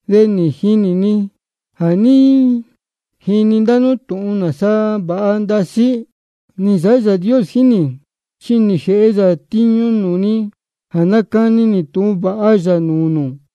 De jínī ni jā ní jini ndá nú tūhun nāsa vāha ndasí nī nsāhá Yāā Dios jíín nī, chi nī jēhe yā tiñu nūū ni jā nácani nī tūhun vāha yā nūū nū.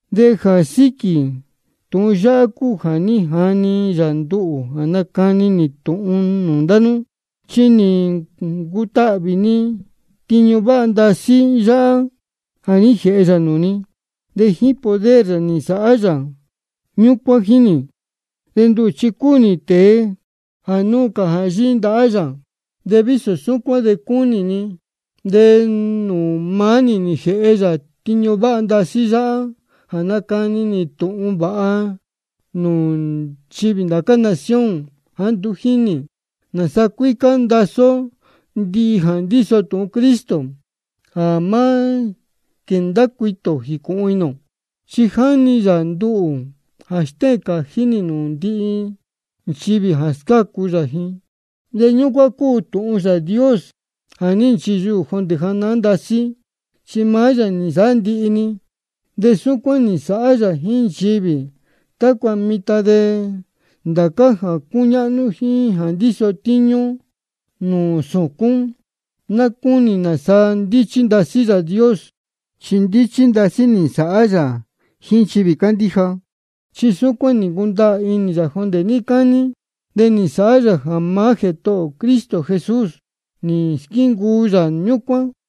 De jā síquī tūhun yáhá cúu jā ní jani yā nduhū jā nácani nī tūhun nūū ndá nú. Chi nī ncutahvī ni tiñu váha ndasí yáhá jā ní jēhe yā nūū ni. De jíín poder yā nī nsāhá yā ñúcuán jíín nī. De nduhū chi cúu nī tēe jā núu cā nūū ndācá nchivī jā núu cā jā yíhí ndahá yā. De vísō súcuán cúu nī, de nūū maá nī nī jēhe yā tiñu váha ndasí yáhá jā nácani nī tūhun vāha yā nūū nchivī ndācá nación jāá nduú jínī, nāsa cuícá ndasí ó ndihi jā ndíso tūhun Cristo, jā má quēndá cuitī ō jīcūhun inī ō. Chi nī jani yā nduhū jā stéhēn cājí nī nūū ndihi nchivī jā scácu yā ji. De ñúcuán cúu tūhun Yāā Dios jā ní nchiyuhū jondē janahán ndasí, chi maá yā nī nsāhá ndihi-ni. De súcuán nī nsāhá yā jíín nchivī, tácua mitan de ndācá jā cúñáhnú jíín jā ndíso tíñú nūū sūcún, ná cúnī nāsa ndíchí ndasí Yāā Dios. Chi ndíchí ndasí nī nsāhá yā jíín nchivī cándíja. Chi súcuán nī ncundaā inī yā jondē níí cání, de nī nsāhá yā jā maá Jētohō ō Cristo Jesús nī squíncuu yā ñúcuán.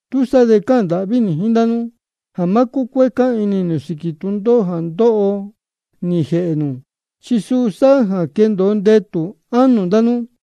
Túsaá de cáhān ndāhví nī jíín ndá nú jā má cúcuécá inī nū sīquī tūndóhó jā ndóho nī jēhē nū. Chi suu sáhá jā quéndōo ndetū ánō ndá nú.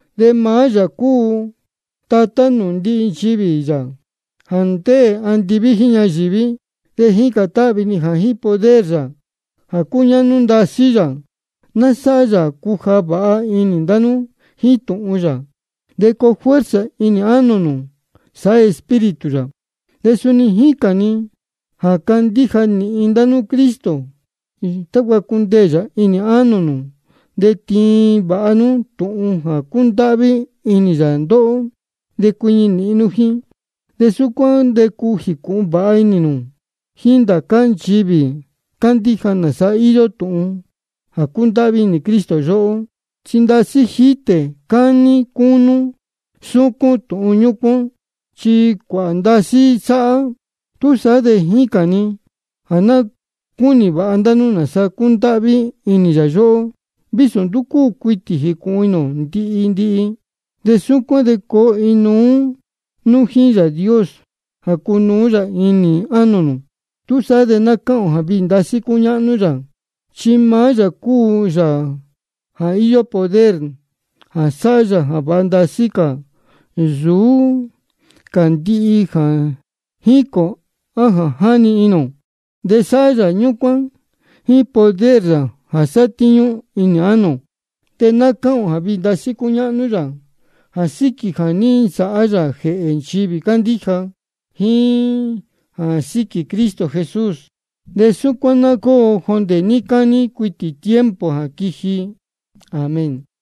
De maá yā cúu Tatá nūū ndihi nchivī yā jā ndéē andiví jíín ñayīví. De jícān táhvī ni jā jíín poder yā jā cúñáhnú ndasí yā, ná sáhá yā jā cuja vāha inī ndá nú jíín tūhun yā, de coo fuerza inī ánō nū, sāhá Espíritu yā. De suni jícān ni jā candíja nīhin ndá nú Cristo, tácua cundeē yā inī ánō nū, de tiin vāha nú tūhun jā cúndáhví inī yā ndóhó, de cuiñi nīhin nú jíín. De súcuán de cuu jīcūhun vāha inī nū jíín ndācá nchivī cándíja, nāsa íyó tūhun jā cúndáhví inī Cristo yóhó. Chi ndasí jítē, cání, cúnú, súcún tūhun ñúcuán, chi cuāhā ndasí sáhá. Túsaá de jícān ni jā ná cúnī vāha ndá nú nāsa cúndáhví inī yā yóhó, vísō nduú cúu cuitī jīcūhun inī ō ndihi ndihi. De súcuán de coo inuú nú jíín Yāā Dios jā cunuú yā inī ánō nū. Túsaá de ná cáhān ō jā viī ndasí cúñáhnú yā, chi maá yā cúu Yāā jā íyó poder jā sāhá yā jā váha ndasí cā nsūú cā ndihi jā jícān ō á jā jáni inī ō. De sáhá yā ñúcuán jíín poder yā jā sátíñú inī ánō ō. De ná cáhān ō jā viī ndasí cúñáhnú yā jā síquī jā ní nsāhá yā jēhē nchivī cándíja jíín jā síquī Cristo Jesús. De súcuán ná cóo jondē níí cání cuitī tiempo jā quiji. Amén.